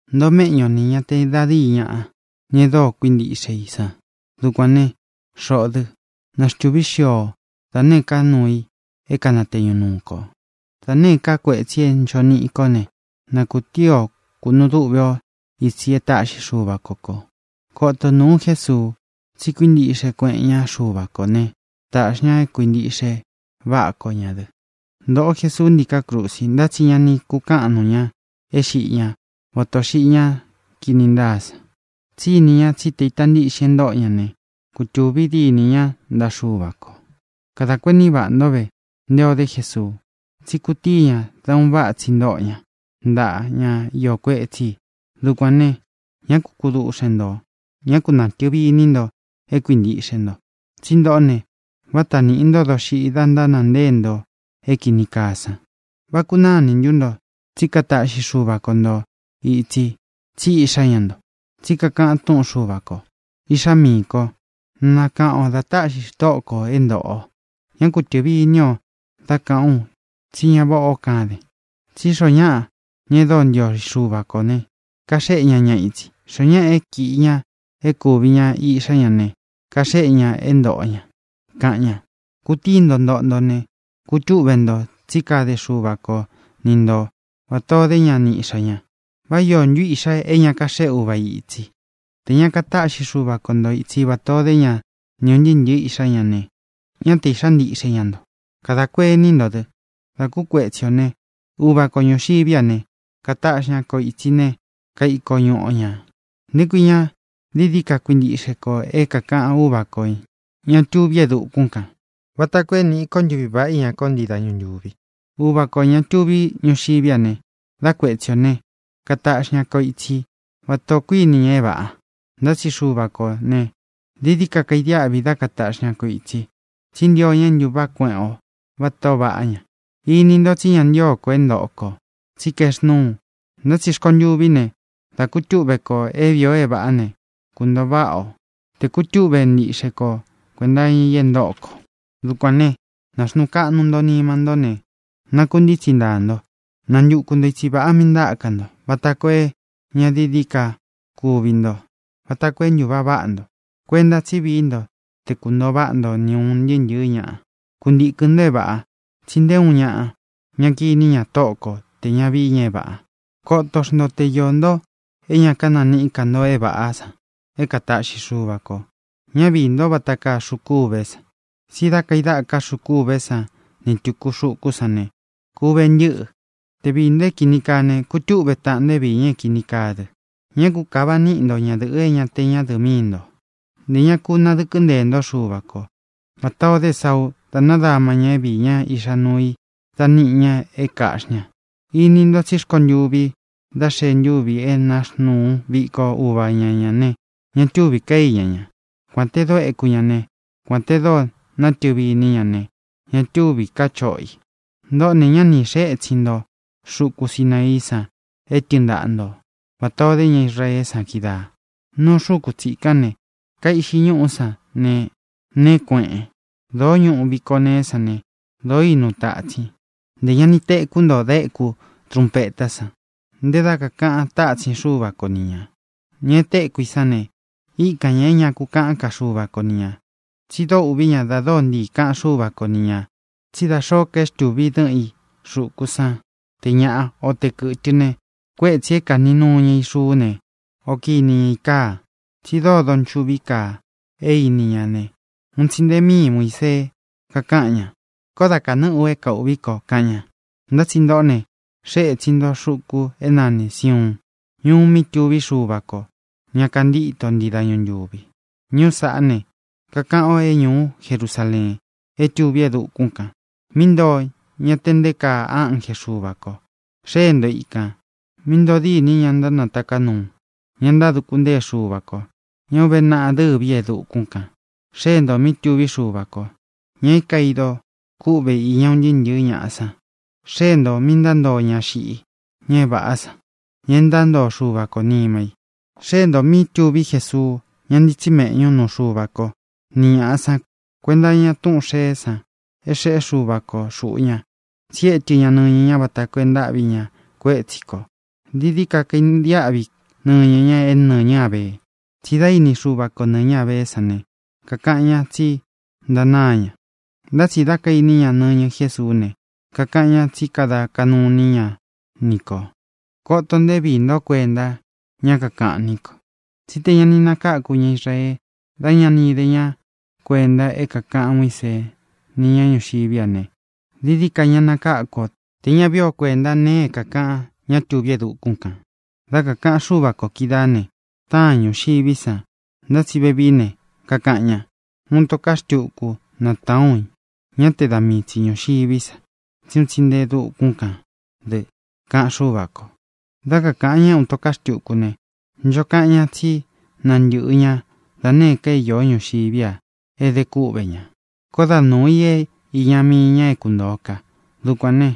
Ntoo méꞌñu o nī ña te da díi ñaꞌa, ña e dóo kuíntiꞌxe i san. Dukuān né, xoꞌō dɨ́, na xtūví xio o da nēé ka nuu i é kanateñu nuu kō, da nēé ka kuetsi é ncho niꞌi i kó ne, na kūtíi o kūnu dúꞌve o itsi e táꞌxi Xuva ko kō. Koto o nūu Jésuu, tsi kuíntiꞌxe kueꞌen ñá Xuva kō né, tāꞌxi ña é kuīntiꞌxe váꞌa ko ñā dɨ. Ntōꞌo Jesuu ntíkā krusi, ntá tsi ña ni kukáꞌan nuu ña é xiꞌi ñá vata ō xiꞌi ñá kini ntáa san, tsí ini ñá tsi te ita ntíꞌxin é ntōꞌo ña ne, kutūvi dínī ñá ntaꞌa Xuva kō. Kadā kuení vaꞌā ntó ve nté ō dé Jesuu, tsí kutíi ña dá un váꞌa tsi ntóꞌo ña ntaꞌa ñá iō kuetsí i. Dukuān ne, ñá ku kuduꞌxen ntō, ñá ku natɨ̄vi iní nto é kuīntiꞌxe nto. Tsí ntoꞌó ne, váta nīꞌi ntó doxiꞌi da ntánāa ntée nto é kīni kaa san. ¿Vá kunáa inī ntú nto tsí kataꞌxi Xuva ko nto ītsi, tsí iꞌxá ña nto? Tsi kakaꞌán túꞌun Xuva kō: Iꞌxá miī kó, na nakaꞌan ō dá taꞌxi Tóꞌo ko ō é ntōꞌo o. Ñá ku tɨ̄vi iní o dá kāꞌán u tsí ña váꞌā ó kaden. Tsí xoo ñáꞌa, ña e dóo ntio Xuva ko ī ne, kaxéꞌe ña ña itsi. Xoó ñaꞌa é kīꞌi ña e kúvi ña iꞌxá ña ne, kaxéꞌe ña é ntōꞌo ña, kaꞌan ña. Kutíi nto ntoꞌo nto ne, kutúꞌve nto, tsí kade Xuva ko ni nto vatā ó de ña ni iꞌxā ña. ¿Vá iō ntú iꞌxa é ña kaxéꞌe uva i itsi? Tē ña katáꞌxi Xuva ko nto itsi vatā ó de ña ni ūn ntɨɨ́ ntɨ̄ɨ́ iꞌxá ña ne, ñá te īꞌxá ntiꞌxe ña nto. Kadā kuení nto dɨ: Dā kú kuetsi ō né, uva ko ñūxiví a ne, kataꞌxi ña ko ītsi ne, kaiko ñuꞌu o ñā. ¿Nté kui ña dií dií ka kuintiꞌxe kō é kākaꞌan Úva kō, ña tuví e dukún kān, vata koo é nīꞌi ko ntuví vaꞌá iña ko ntii dañu ntúvi? Uva kō, ña tuví ñuxiví a ne, dá kuetsi ō ne, kataꞌxi ña ko itsi vatā ó kuiní ña é vāꞌa. Ntá tsi Xuva kō ne, dií dií ka kaidiáꞌvi dá kataꞌxi ña ko ītsi, tsí ntio ña é ntūváꞌa kueꞌen o váta ō vaꞌá ña. Ini ntó tsi ña ntío ko é ntōꞌo ko, tsí kaexnúu. Ntá tsi rkontuví ne, dá kūtúꞌve kō é vīi o é vāꞌá ne, kuntōo váꞌa o, tē kutúꞌve ntiꞌxe ko kuēnta iña i é ntōꞌo ko. Dukuān né, nāxnuu kaꞌnu nto nima ntó ne, nakuntítsi ntāa nto. Nantuku nto itsi vāꞌa míꞌī ntáka nto, vata koo é ña dií dií ka kuvi nto, vata koo é ntūváꞌa váꞌa nto. Kuenta tsi vií nto te kuntōo váꞌa nto ni ūn ntɨɨ́ ntɨ̄ɨ́ ñaꞌa. Kuntīkɨn nto é vāꞌa, tsi nté uun ñaꞌa ña kiní ña Tóꞌo ko tē ña vií ña é vāꞌa. Koto xnto te iō nto é ña kananiꞌí ka nto é vāꞌá san é kataꞌxi Xuva kō. Ñá viī ntó vata kaa xuku ûvé san. Tsí da kaidáka xuku ûvé san ni tūku xukú san ne, ku uve ntɨ́ꞌɨ. Te viī nto é kīni kaa ne, kutúꞌve taꞌan nto é viī ña é kīni kaa dɨ. Ña ku kava niꞌi nto ñadɨ̄ꞌɨ é ña te ñádɨ̄ꞌɨ míi ntō; ntē ña ku nadɨkɨ́ nteē ntó Xuva ko, vatā o dé Esauu dá nadama ñā é viī ñá iꞌxa nuu i dá niꞌi ña é kaꞌxī ña. Ini nto tsí rkontuvi dá xee ntúvi e náxnuu viko uva ña ñā ne, ña túvī ká iña ña. Kuān te dóo éku ña ne, kuān te dóo nátɨvi iní ña ne, ña túvī ká choꞌo i. Ntōꞌó ne, ñá ni xēe étsin nto xuku Sinaií san é tɨɨn ntaꞌa nto vatā o dé ña Israeé san kídaā. Núu xūku tsikán ne, kaiꞌxi ñúꞌú san ne, neé kueꞌen. Dōó ñuꞌu viko neé san ne, dōo ínu tatsin. Ntē ña ni tekú nto da éku trunpetá san, ntē dá kakāꞌan tátsin Xuva ko ni ñā. Ña e téku i sán ne, íkan ña é ña ku kaꞌán ka Xuva ko ni ñā. Tsi dóo ūꞌví ña da dóo ntiī kaꞌan Xúva ko ni ñā tsí da xōó ka é xtūvi i dɨ́ꞌɨn i xuku san, te ñāꞌá o te kɨ̄tɨ ne, kuétsī é kāꞌní nuu ña i xuú ne, o kini ña ī káā. Tsi dóo donchuꞌví kaa é ini ña ne, un tsi nte míi Muīsee kakáꞌan ña: “Koó da kānɨ́ꞌɨ u é kaūꞌví ko”, kaꞌan ña. Ntá tsi ntōꞌó ne, xée ētsin nto xuku é nanī Siuun, ñuu mí tuví Xuva kō, ña kantíto ntii dañu ntūvi. Ñuú saꞌá ne, kakaꞌan o é ñūú Jerusaleen é tuví e dukún kān, míꞌi ntoo ña te nté kaa ánje Xuva kō. Xée nto ikān, míꞌi ntoo dîni ña ntánataká nuu, ña ntáduku ntée Xuva kō, ña é ūve naꞌa dɨ́vi ī e dukún kān. Xée ntō mí tuví Xuva kō, ña é kaidō kûꞌvé iña un ntɨɨ́ ntɨ̄ɨ́ ñaꞌa san. Xée ntō mí ntántoo ña xiꞌi, ña é vāꞌá san, ña e ntántoo Xuva ko nima i. Xée ntō mí tuví Jesuu, ñá ntitsí meꞌñu nuu Xuva ko ni ñāꞌa san kuenta iña túꞌūn xeé san é xeꞌé Xuva ko xūꞌu ña, tsi étɨ ña nɨñɨ ña vata koo é ntáꞌvi ña kuétsi kō. Dií dií ka kaidiáꞌvi nɨñɨ ña é nɨ̄ñɨ Ábee. Tsí dā íni Xuva ko nɨ̄ñɨ Ábeé san ne, kakaꞌan ñá tsi ntanáa ña. Ntá tsi dá kaīní ña nɨñɨ Jésuú ne, kakaꞌan ñá tsi kada kaꞌnu iní ña ni kō. Koto nto é viī ntó kuenta ñá kakaꞌan ni ko. Tsí tē ña ni nakáku ña Israee dá ña ni ide ña kuénta é kākaꞌan Muísee ni ña ñúxiví a ne, dií dií ka ña nakáku o tē ña vií o kuēntá nēe é kākaꞌan ñá tuví e dukún kān. Dá kakāꞌan Xúva kō kídaā né, táān ñuxiví san. Ntá tsi vevií ne, kakaꞌan ña: “Uun ito ká xtuku natāán u ñá te da mii tsi ñūxiví sa, tsí un tsi nte e dukún kān dɨ”, kaꞌan Xúva kō. Dá kakāꞌan ñá é “uun ito ká xtuku” ne, ncho kaꞌan ñá tsi nantɨꞌɨ ña da nēé ka é īó ñuxiví a é ede kúꞌvē ña. Koó da nuū i íña mii ñā é kuntōo ka. Dukuān ne,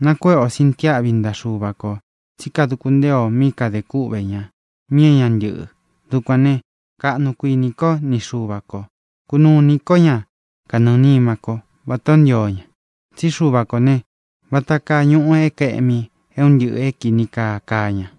nakuéꞌe ō sintiáꞌvi ntaꞌa Xuva kō tsí kaduku ntée ō mí kadē kúꞌvē ña, mí é ña ntɨ́ꞌɨ. Dukuān ne, kaꞌnu kuinī ko ni Xuva ko. Kunuu inī kó ña kanɨɨ̄ nima kó, vatā ó ntio ña. Tsí Xuva kō ne, vata kaa ñuꞌu é kaēꞌmi é un ntɨꞌɨ̄ é kīni kaa kaa ña.